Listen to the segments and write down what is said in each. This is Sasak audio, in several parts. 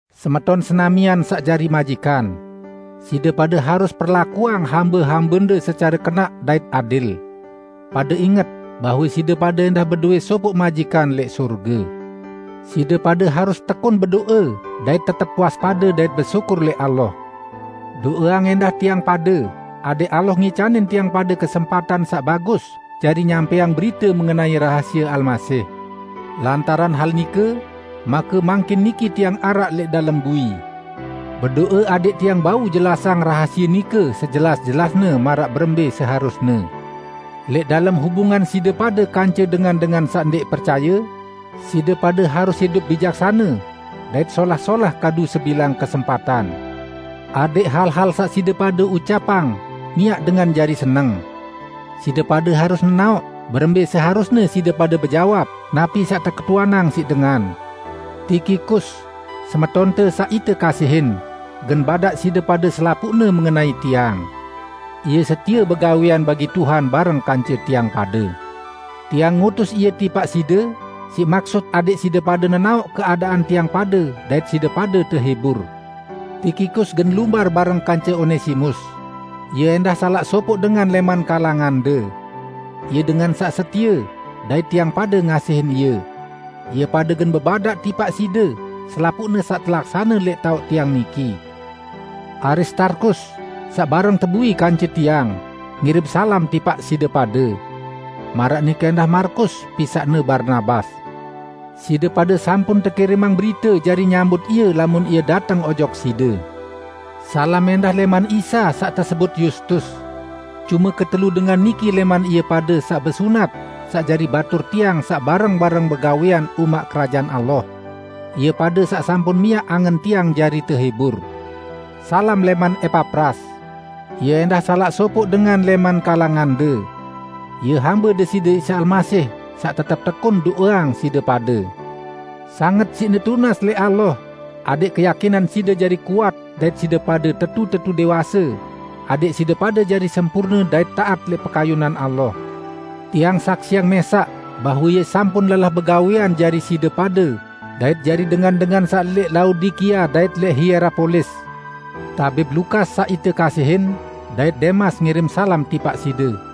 Semeton senamian saq jari majikan! Side pade harus perlakuang hambe-hambende secare kenaq dait adil. Pade inget bahwe side pade ẽndah bedowẽ sopoq majikan lẽq sorge. Side pade harus tekun bedo'e dait tetep waspade dait besyukur lẽq Allah. Do'eang ẽndah tiang pade adẽq Allah ngicanin tiang pade kesempatan saq bagus jari nyampẽang berite mengenai rahasie Almasih. Lantaran hal nike make mangkin niki tiang araq lẽq dalem bui. Bedo'e adẽq tiang bau jelasang rahasie nike sejelas-jelasne maraq berembẽ seharusne. Lẽq dalem hubungan side pade kance dengan-dengan saq ndẽq percaye, side pade harus idup bijaksane dait solah-solah kadu sebilang kesempatan. Adẽq hal-hal saq side pade ucapang miaq dengan jari seneng. Side pade harus nenaoq berembẽ seharusne side pade bejawab napi saq teketuanang siq dengan. Tikikus, semetonte saq ite kasihin, gen badaq side pade selapuqne mengenai tiang. Ie setie begawẽan bagi Tuhan bareng kance tiang pade. Tiang ngutus ie tipaq side siq maksut adẽq side pade nenaoq keadaan tiang pade dait side pade tehibur. Tikikus gen lumbar bareng kance Onesimus; ie ẽndah salaq sopoq dengan lẽman kalangande. Ie dengan saq setie, dait tiang pade ngasihin ie. Ie pade gen bebadaq tipaq side selapuq hal saq telaksane lẽq taoq tiang niki. Aristarkus, saq bareng tebui kance tiang, ngirim salam tipaq side pade. Maraq nike ẽndah Markus, pisaqne Barnabas. (Side pade sampun tekirimang berite jari nyambut ie lamun ie dateng ojok side.) Salam ẽndah lẽman Isa saq tesebut Yustus. Cume ketelu dengan niki lẽman ie pade saq besunat saq jari batur tiang saq bareng-bareng begawẽan umaq Kerajaan Allah; ie pade saq sampun miaq angen tiang jari tehibur. Salam lẽman Epapras. Ie ẽndah salaq sopoq dengan lẽman kalangande. Ie hambe Deside Isa Almasih, saq tetep tekun do'eang side pade. Sanget siqne tunas lẽq Allah adẽq keyakinan side jari kuat dait side pade tetu-tetu dẽwase, adẽq side pade jari sempurne dait taat lẽq pekayunan Allah. Tiang saksiang mẽsaq bahwe ie sampun lelah begawẽan jari side pade dait jari dengan-dengan saq lẽq Laodikia dait lẽq Hierapolis. Tabib Lukas, saq ite kasihin, dait Demas ngirim salam tipaq side.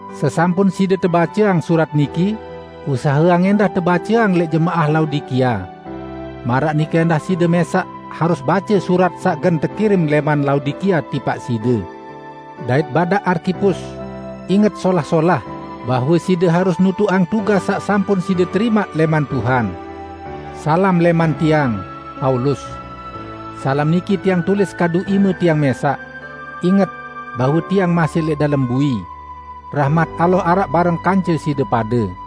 Sesampun side tebaceang surat niki, usaheang ẽndah tebaceang lẽq jemaah Laodikia. Maraq nike ẽndah side mẽsaq harus bace surat saq gen tekirim lẽman Laodikia tipaq side. Dait badaq Arkipus, "Inget solah-solah bahwe side harus nutuqang tugas saq sampun side terimaq lẽman Tuhan." Salam niki tiang tulis kadu ime tiang mẽsaq. Inget bahwe tiang masih lẽq dalem bui! Rahmat Allah araq bareng kance side pade.